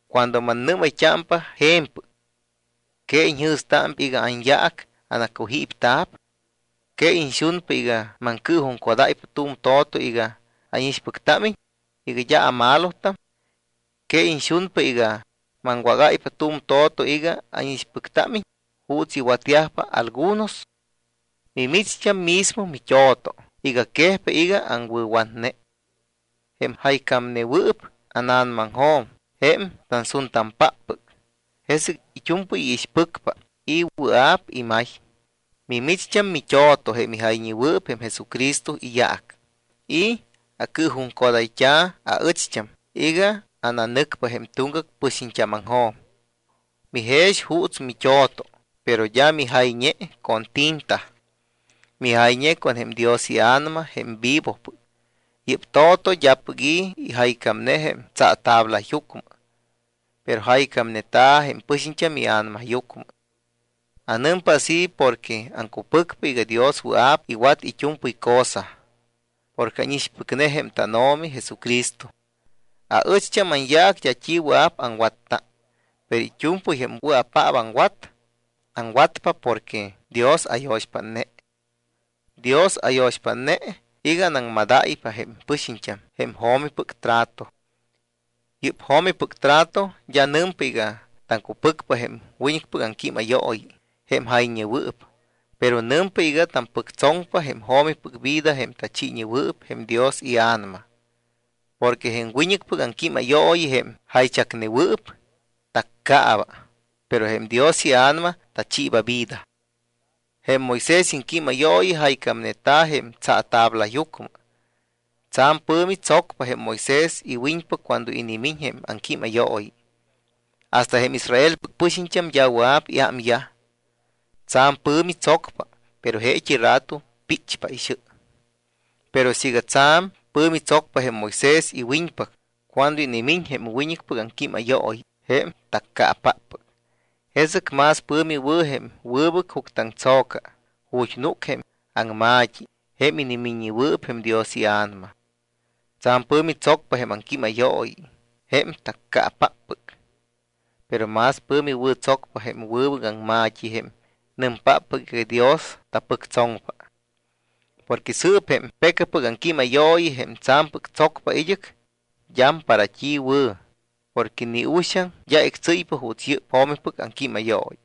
Cuando mannɨ́mayt́ámpa je̱mpɨc, ¿que iñjɨ̱stámpa iga anyaac anacujípta̱p? ¿Que iñxunpa iga maŋcɨɨjuŋcodáypa tu̱m to̱to iga ánixpɨctámiñ, iga d́a amalotam? ¿Que iñxunpa iga maŋwágáypa tu̱m to̱to iga ánixpɨctámiñ juuts iwatyajpa algunos? Mimicht́am mismo mit́o̱to iga quejpa iga aŋwɨ̱watne. Jém jaycámnewɨɨp ána̱namaŋjo̱m jém tansuntampáppɨc. Jesɨc it́u̱mpɨy iixpɨcpa y wɨa̱p imay. Mimicht́am mit́o̱to jém ijayñewɨɨp jém Jesucristo iyaac y acɨɨjuŋcodayt́a̱ aɨcht́am iga ananɨcpa jém tuŋgac pɨxiñt́ámaŋjo̱m. Mijex juuts mit́o̱to, pero d́a mijayñe con tinta, mijayñe con jém Dios iA̱nama jém vivopɨc. Yɨ́p to̱to d́apɨc i̱ ijaycámne jém tsaatablayucmɨ, pero jaycámneta̱ jém pɨ̱xiñ ia̱namayucmɨ. Anɨmpa así porque aŋcupɨcpa iga Dios wɨa̱p iwat it́u̱mpɨy cosa porque ánixpɨcne jém tánO̱mi Jesucristo. Aɨcht́am anyaac d́a t́i wɨa̱p aŋwatta, pero it́u̱mpɨy jém wɨa̱paap aŋwat, aŋwatpa porque Dios ayo̱xpátne. Dios ayo̱xpátne iga anaŋmadáypa jém pɨxiñt́am jém jo̱mipɨc trato. Yɨ́p jo̱mipɨc trato d́a nɨmpa iga taŋcupɨcpa jém wiñɨcpɨc aŋquímayooyi, jém jayñewɨɨp, pero nɨmpa iga tampɨctsoŋpa jém jo̱mipɨc vida, jém tachiiñewɨɨp jém Dios iA̱nama. Porque jém wiñɨcpɨc aŋquímayooyi, jém jaychacnewɨɨp, taccaaba, pero jém Dios iA̱nama tachiiba vida. Jém Moisés iŋquímayooyi jaycámneta̱ jém tsaatablayucmɨ. Tsa̱m pɨ̱mi tsocpa jém Moisés iwiñpac cuando inimiñ jém aŋquímayooyi. Hasta jém Israelpɨc pɨxiñt́am d́a wɨa̱p iámyaj. Tsa̱m pɨ̱mi tsocpa, pero jeet́i rato píchpa ixɨ. Pero siiga tsa̱m pɨ̱mi tsocpa jém Moisés iwiñpac cuando inimiñ jém wiñɨcpɨc aŋquímayooyi, jém taccaapáppɨc, jesɨc más pɨ̱mi wɨ̱ jém wɨbɨc juctɨaŋtso̱ca ju̱t́ núc jém aŋma̱t́i jém inimiññewɨɨp jém Dios iA̱nama. Tsa̱m pɨ̱mi tsocpa jém aŋquímayooyi, jém taccaapáppɨc, pero más pɨ̱mi wɨ̱tsocpa jém wɨbɨc aŋma̱t́i, jém nɨmpáppɨc iga Dios tapɨctsoŋpa. Porque sɨɨp jém pecapɨc aŋquímayooyi, jém tsa̱mpɨc tsocpa id́ɨc, d́am para t́i wɨ̱ porque ni uxaŋ d́a ictsɨ́ypa juuts yɨ́p jo̱mipɨc aŋquímayooyi.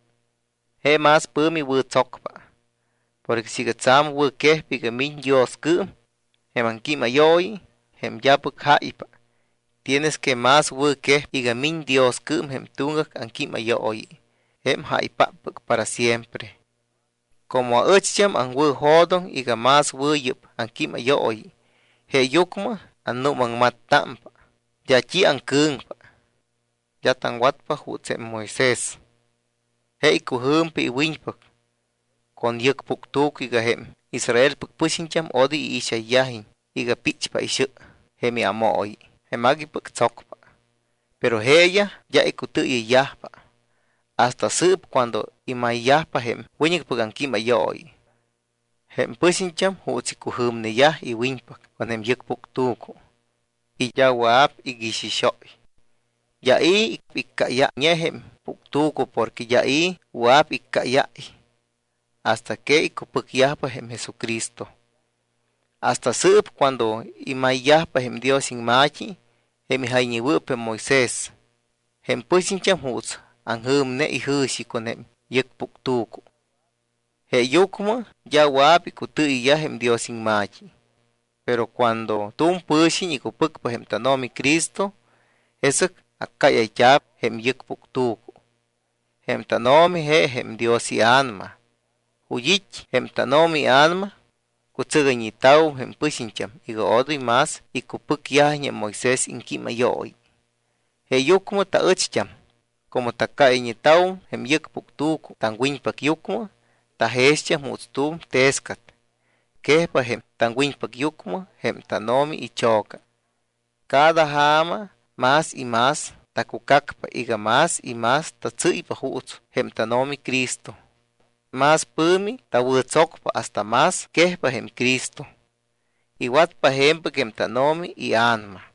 Je más pɨ̱mi wɨ̱tsocpa. Porque siiga tsa̱m wɨ̱quejpa iga miñ Dioscɨɨm jém aŋquímayooyi, jém d́apɨc jáypa, tienes que más wɨ̱quejpa iga miñ Dioscɨɨm jém tuŋgac aŋquímayooyi, jém jáypáppɨc para siempre. Como aɨcht́am aŋwɨ̱jo̱doŋ iga más wɨ̱ yɨ́p aŋquímayooyi, jeeyucmɨ annuumaŋmattámpa, d́a t́i aŋcɨ̱ŋpa. D́a taŋwatpa juuts jém Moisés. Je icujɨ̱mpa iwiñpac con tu̱m yɨc puctu̱cu iga jém Israelpɨc pɨxiñt́am odoy iixayyajiñ iga píchpa ixɨ jém iámooyi, jém aguipɨc tsocpa. Pero jeeyaj d́a icutɨɨyɨyyajpa. Hasta sɨɨp cuando imayyajpa jém wiñɨcpɨc aŋquímayooyi, jém pɨxiñt́am juuts icujɨ̱mneyaj iwiñpac con jém yɨc puctu̱cu y d́a wɨa̱p iguixixóy. D́a i̱ iccáyayñe jém puctu̱cu porque d́a i̱ wɨa̱p iccáyáy hasta que icupɨcyajpa jém Jesucristo. Hasta sɨɨp cuando imayyajpa jém Dios iŋma̱t́i, jém ijayñewɨɨp jém Moisés, jém pɨxiñt́am juuts aŋjɨ̱mne ijɨ̱xi con jém yɨc puctu̱cu. Jeeyucmɨ d́a wɨa̱p icutɨɨyɨyyaj jém Dios iŋma̱t́i. Pero cuando tu̱m pɨ̱xiñ icupɨcpa jém tánO̱mi Cristo, jesɨc accáyayt́a̱p jém yɨc puctu̱cu. Jém tánO̱mi je jém Dios iA̱nama. Ju̱t́ it́ jém tánO̱mi iA̱nama, cutsɨgayñeta̱wum jém pɨxiñt́am iga odoy más icupɨcyajiñ jém Moisés iŋquímayooyi. Jeeyucmɨ taɨcht́am como taccáyayñeta̱wum jém yɨc puctu̱cu taŋwiñpacyucmɨ, tajext́am juuts tu̱m tescat. Quejpa jém taŋwiñpacyucmɨ jém tánO̱mi icho̱ca. Cada ja̱ma más y más tacucacpa iga más y más tatsɨ́ypa juuts jém tánO̱mi Cristo. Más pɨ̱mi tawɨ̱tsocpa hasta más quejpa jém Cristo. Iwatpa je̱mpɨc jém tánO̱mi iA̱nama.